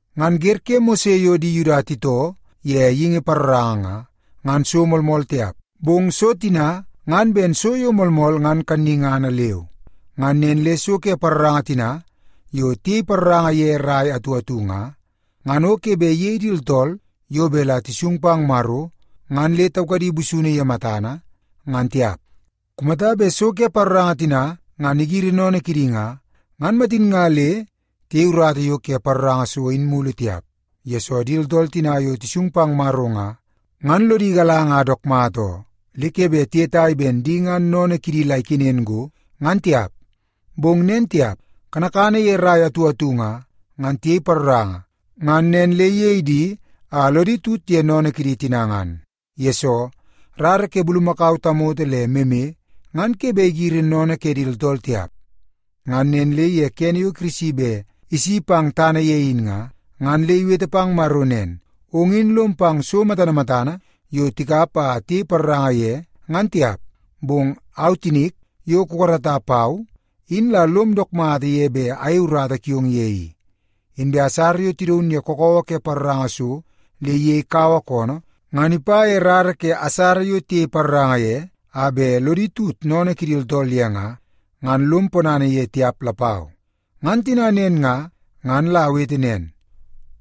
Ngan wer ke Mose yo di Yuda titoo ye geingi paroranga nga, ngan so moolmool tiap, bong so tina ngan ben so yo moolmool ngan kannungana leu. Ngan nen le so ke paroranga tina yo tiyei paroranga ye rai atu atu nga, ngan o ke bet iyei di tooltool yo bet la tisung pang Maro ngan le taukadi busunu ye matana, ngan tiap. Kumata bet so ke paroranga tina ngan igiri sennene kidi nga, ngan matin nga le tiyei urata yo ke paroranga so in mulu tiap, yesoo di tooltool tina yo tisung pang Maro nga, ngan lodi igalanga a dook mata oo, le ke bet tiyetai ben di ngan sennene kidi la ikenen go, ngan tiap. Bong nen tiap. Kanakana ye rai atu atu nga, ngan tiyei paroranga ngan nen le iyei di a lodi tut ye sennene kidi tina ngan. Yesoo, rara ke bulumakau tamoto le meme ngan ke bet igiri sennene ke di tooltool tiap. Ngan nen le ye kene yo Kirisi bet isi pang tana ye in nga, ngan le iwete pang Maro nen, “Ong in lom pang so matana matana yo tikap a tiyei paroranga ye ngan tiap, bong au tinik, yo kukarata pau, in la lom dook mata ye bet ayei urata kiong ye i. Inbe asara yo tidaun ye kakawa ke paroranga so le iyei kaua koonoo, ngan ipa ye rara ke asara yo tiyei paroranga ye, a bet lodi tut sennene kidi tooltool ye nga, ngan lom ponana ye tiap lapau. Ngan tina nen nga, ngan la awete nen,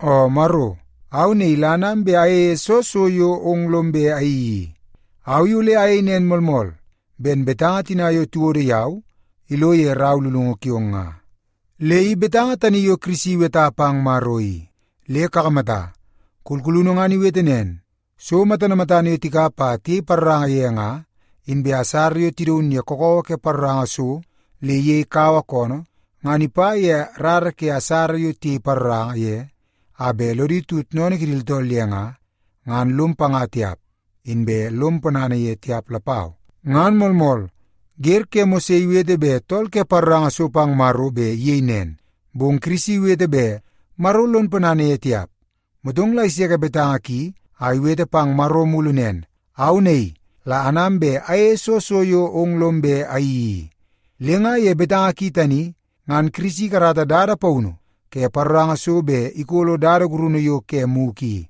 ‘O Maro! Au naii la anam bet ayeie soo so yo ong lom bet ayeii i. Au i ole ayei nen moolmool, ben betanga tina yo tiwodo yau ilo ye rau lulungu kiong nga.’” Le i betanga tani yo Kirisi iweta pang Maro i. Le kakamata, kulkulunu ngan iwete nen, “So matana matana yo tikap a tiyei paroranga ye nga, inbe asara yo tidaun ye kakawa ke paroranga so le iyei kaua koonoo, ngan ipa ye rara ke asara yo tiyei paroranga ye a bet lodi tut sennene kidi tooltool ye nga, ngan lom panga tiap, inbe lom ponana ye tiap lapau.” Ngan moolmool, wer ke Mose iwete bet tool ke paroranga so pang Maro bet iyei nen, bong Kirisi iwete bet Maro lon ponana ye tiap. Motong la iseke betanga ki a iwete pang Maro mulu nen, “Au naii la anam bet ayeie soo so yo ong lom bet ayeii i.” Le nga ye betanga ki tani, ngan Kirisi ikarata dada paunu ke paroranga so bet ikolo dada gurunu yo ke mugu i.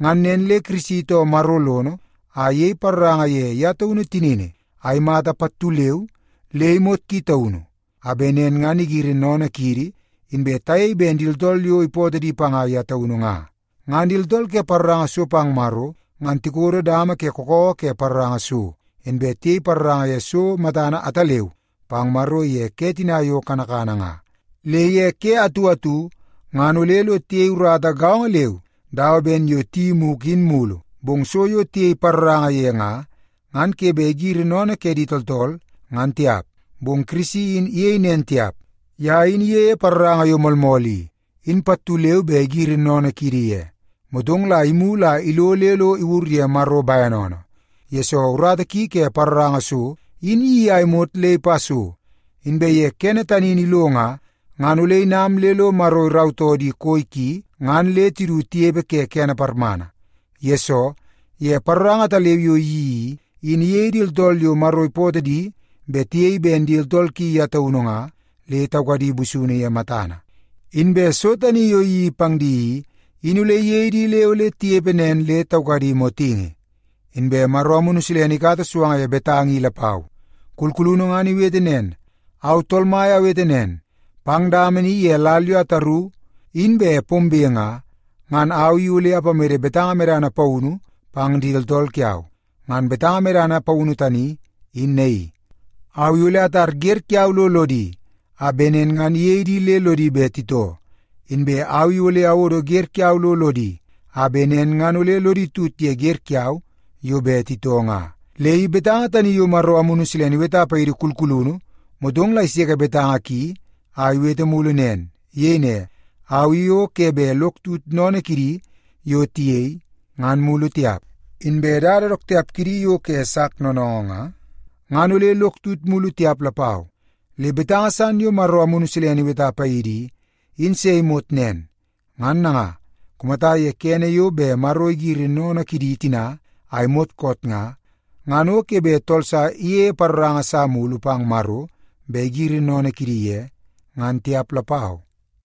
Ngan nen le Yesu Kirisi itoo Maro lono a iyei paroranga ye ye taunu tinini a imata pattu leu le imot ki taunu, a bet nen ngan igiri sennene kiidi, inbe tayei ben di tooltool yo ipootoo di panga ye taunu nga. Ngan di tooltool ke paroranga so pang Maro, ngan tikodo dama ke kakawa ke paroranga so, inbe tiyei paroranga ye so matana ataleu pang Maro ye ke tina yo kanakana nga. Le ye ke atu atu ngan ole lo tiyei urata gaongo leu dawa ben yo tiyeii mugu in mulu, bong so yo tiyei paroranga ye nga, ngan ke bet igiri sennene ke di tooltool, ngan tiap. Bong Kirisi in iyei nen tiap. Ye in iyeie paroranga yo moolmool i, in pattu leu be igiri sennene kiidi ye. Motong la imulu a ilo le lo iwur ye Maro bene oonoo, yesoo urata ki ke paroranga so, in iyeii a imot le ipa so. Inbe ye kene tani in ilo nga, ngan ole inam le lo Maro irautoo di koi ki ngan le tidu tinepe ke kene parmana. Yesoo, ye paroranga ataleu yo iyeii i, in iyei di tooltool yo Maro ipootoo di bet tiyei ben di tooltool ki ye taunu nga, le taukadi busunu ye matana. Inbe so tani yo iyeii pang di i, in ole iyei di le ole tinepe nen le taukadi motingi. Inbe Maro Amunu Silene ikata suanga ye betanga i lapau. Kulkulunu ngan iwete nen, “Au Tool Mai awete nen, pang dama ni ye lal yo ataru in bet pombe nga, ngan au i ole ipamede betanga medana paunu pang di tooltool kiau. Ngan betanga medana paunu tani in naii: Au i ole atar wer kiau lo lodi, a bet nen ngan iyei di le lodi bet titoo, inbe au i ole awodo wer kiau lo lodi, a bet nen ngan ole lodi tut ye wer kiau yo bet titoo nga.” Le i betanga tani yo Maro Amunu Silene iweta paidi kulkulunu, motong la iseke betanga ki a iwete mulu nen. Iyei ne, “Au i o ke bet lok tut sennene kidi yo tiyei, ngan mulu tiap. Inbe dada dook tiap kidi yo ke sak noonoongoo nga, ngan ole lok tut mulu tiap lapau.” Le betanga san yo Maro Amunu Silene iweta paidi i, in se imot nen. Ngan nanga, kumata ye kene yo bet Maro igiri sennene kidi tina a imot koot nga, ngan o ke bet tool sa iyeie paroranga sa mulu pang Maro bet igiri sennene kidi ye, ngan tiap lapau.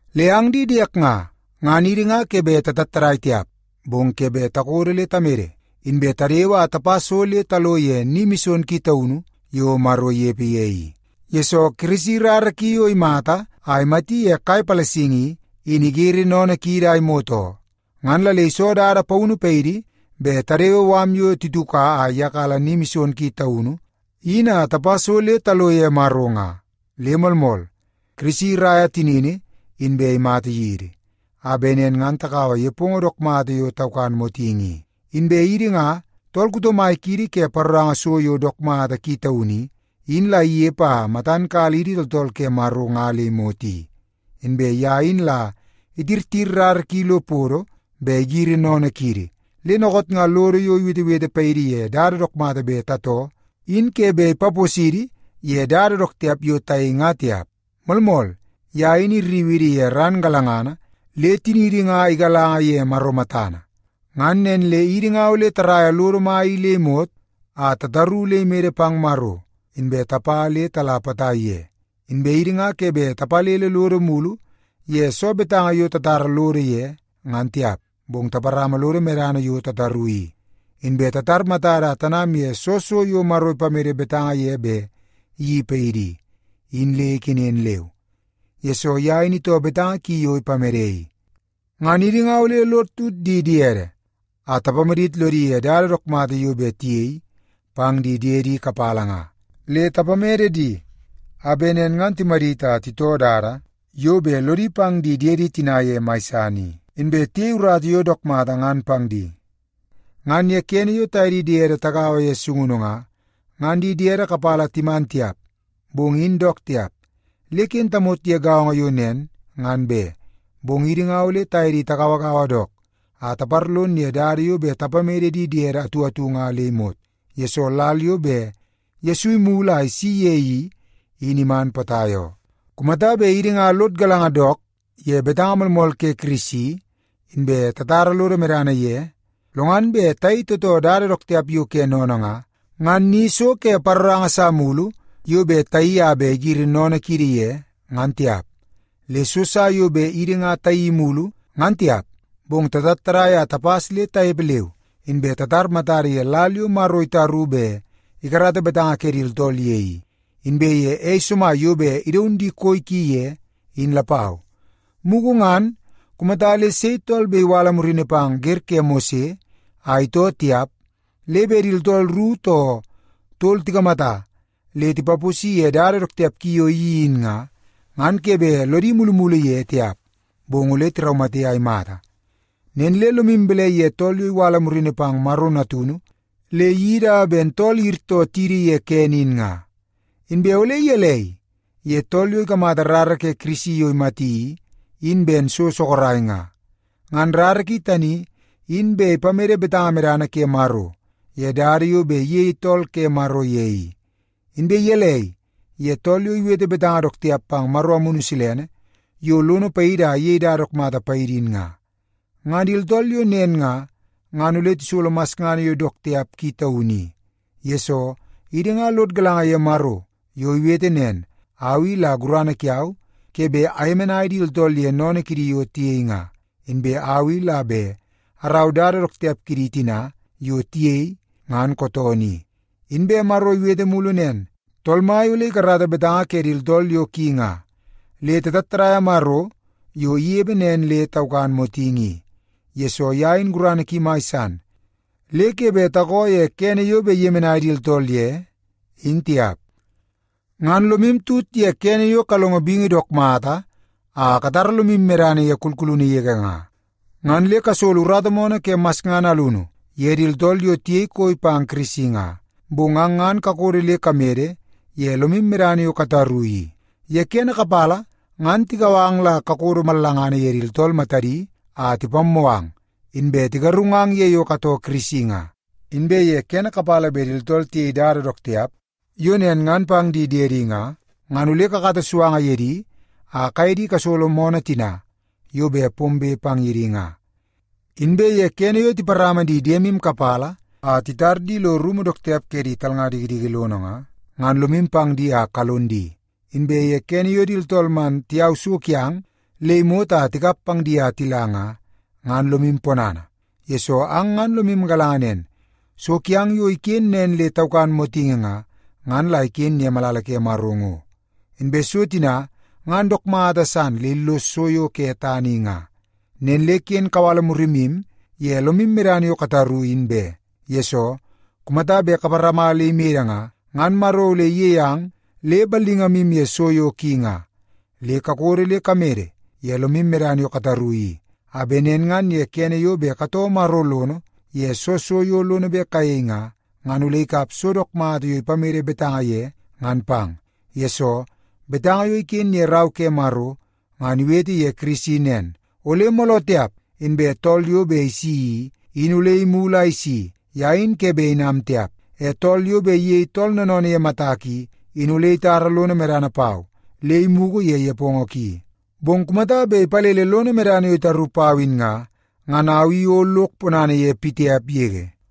Le ang di diek nga, ngan idi nga ke bet tatattadai tiap, bong ke bet takodo le tamede, inbe tadewe a tapa so le talo ye Ni Mison Ki Taunu yo Maro inepe ye i. Yesoo, Kirisi rara ki yo imata a imati ye kai palasingi i, in igiri sennene kiidi a imot oo. Ngan la le iso dada paunu paidi bet tadewe mala yo tituka a iyakala Ni Mison Ki Taunu in a tapa so le talo ye Maro nga. Le moolmool, Kirisi iraia tinini inbe imata yidi, a bet nen ngan takaua nepongo dook mata yo taukan motingi i. Inbe idi nga, tool kuto mai kiidi ke paroranga so yo dook mata ki taunu i, in la inepe a matan kala idi tooltool ke Maro nga le imot i. Inbe ye in la itirtir rara ki lo podo bet igiri sennene kiidi, le dookoot nga lodo yo iwetewete paidi ye dada dook mata bet tatoo, in ke bet ipaposidi ye dada dook tiap yo tayei nga tiap. Moolmool, ye in irriu idi ye ran galangana le tiniidi nga igalanga ye Maro matana. Ngan nen le idi nga ole taraia lodo mai i le imot a tataru le imede pang Maro, inbe tapa le tala potai ye. Inbe idi nga ke bet tapalele lodo mulu ye soo betanga yo tatara lodo ye, ngan tiap, bong taparama lodo medana yo tataru i. Inbe tatar matada a tanam ye soo so yo Maro ipamede betanga ye bet iyeii paidi i, in le ikenen leu, yesoo ye in itoo betanga ki yo ipamede i. Ngan idi nga ole lod tut di diede a tapamadit lodi ye dada dook mata yo bet tiyei pang di diedi kapala nga. Le tapamede di a bet nen ngan timadit a titoo dada yo bet lodi pang di diede tina ye mai san i, inbe tiyei urata yo dook mata ngan pang di. Ngan ye kene yo taye di diede tagaua ye sungunu nga, ngan di diede kapala timan tiap, bong in dook tiap, le ken tamot ye gaongo yo nen, ngan be. Bong idi nga ole taye di tagauagaua dook a taparlon ye dada yo bet tapamede di diede atu atu nga le imot, yesoo lal yo bet Yesu imulu a isi ye i, in iman potai oo. Kumata bet idi nga lod galanga dook ye betanga moolmool ke Kirisi inbe tatara lodo medana ye, lo ngan bet tayei tootoo dada dook tiap yo ke sennene nga, ngan ni so ke paroranga sa mulu yo bet tayeii a bet igiri sennene kiidi ye, ngan tiap. Le so sa yo bet idi nga tayeii mulu ngan tiap, bong tatattadai a tapas le tanepe leu, inbe tatar matada ye lal yo Maro itaru bet ikarata betanga ke di tooltool ye i, inbe ye ei somai yo bet idaun di koi ki ye, in lapau. Mugu ngan, kumata le sei tool bet iwala murini pang wer ke Mose a itoo tiap, le bet di tooltool ru too tol tikamata le tipaposi ye dada dook tiap ki yo iyeii in nga, ngan ke bet lodi mulumulu ye tiap, bong ole tiraumate a imata. Nen le lomu balai ye tool yo iwala murini pang Maro Natunu le iyeii dawa ben tool iyirtoo tidi ye kene in nga? Inbe ole gelei ye tool yo ikamata rara ke Kirisi yo imata i, in ben so sorok nga? Ngan rara ki tani, in bet ipamede betanga medana ke Maro ye dada yo bet iyei tool ke Maro ye i. Inbe gelei ye tool yo iwete betanga dook tiap pang Maro Amunu Silene yo lono paidi a iyei dada dook mata paidi in nga? Ngan di tooltool yo nen nga, ngan ole tisolo masngana yo dook tiap ki taunu i. Yesoo, idi nga lod galanga ye Maro yo iwete nen, “Au i la gurana kiau ke bet ayemenai di tooltool ye sennene kidi yo tiyei nga. Inbe au i la bet arau dada dook tiap kidi tina yo tiyei ngan kootoonoo i.” Inbe Maro iwete mulu nen, “Tool Mai ole ikarata betanga ke di tooltool yo ki nga.” Le tatattadaia Maro yo inepe nen le taukan motingi i, yesoo ye in gurana ki mai san le ke bet takoo ye kene yo bet iyemenai di tooltool ye, in tiap. Ngan lomu tut ye kene yo kalongo bingi dook mata a katara lomu medana ye kulkulunu yege nga, ngan le kasolo urata moonoo ke masngana alunu ye di tooltool yo tiyei koi pang Kirisi nga. Bong ang ngan kakodo le kamede ye lomu medana yo kataru i. Ye kene kapala ngan tikau ang la kakodo mallangana ye di tooltool matadi a tipammoo ang, inbe tigarungang ye yo katoo Kirisi nga. Inbe ye kene kapala bet di tooltool tiyei dada dook tiap yo nen ngan pang di diemu nga, ngan ole kakata suanga ye di a kaye di kasolo moonoo tina yo bet pombe pang ye di nga. Inbe ye kene yo tiparama di diemu kapala a titar di lo rumu dook tiap ke di talnga dikidiki lono nga, ngan lomu pang di a kalon di. Inbe ye kene yo di tooltool man tiyau so kiang le imot a tikap pang di a tila nga, ngan lomu ponana, yesoo ang ngan lomu galanga nen, so kiang yo iken nen le taukan motingi nga, ngan la iken ye malala ke Maro ngo. Inbe so tina ngan dook mata san le illos so yo ke tana i nga. Nen le ken kawala murimu ye lomu medana yo kataru, in be, yesoo kumata bet kaparama le imede nga, ngan Maro ole iyei ang le ballingamu ye so yo ki nga. Le kakodo le kamede ye lomu medana yo kataru i, a bet nen ngan ye kene yo bet katoo Maro lono ye soo so yo lono bet kayei nga, ngan ole ikap so dook mata yo ipamede betanga ye ngan pang. Yesoo, betanga yo iken ye Rau ke Maro ngan iwete ye Kirisi nen, “Ole mooloo tiap inbe tool yo bet isi i, in ole imulu a isi. Ye in ke bet inam tiap. E tool yo bet iyei tool noonoonoo ye matak i, in ole itara lono medana pau le imugu ye nepongo ki. Bong kumata bet ipalele lono medana yo itaru pau in nga, ngan au i o lok ponana ye pitiap yege.”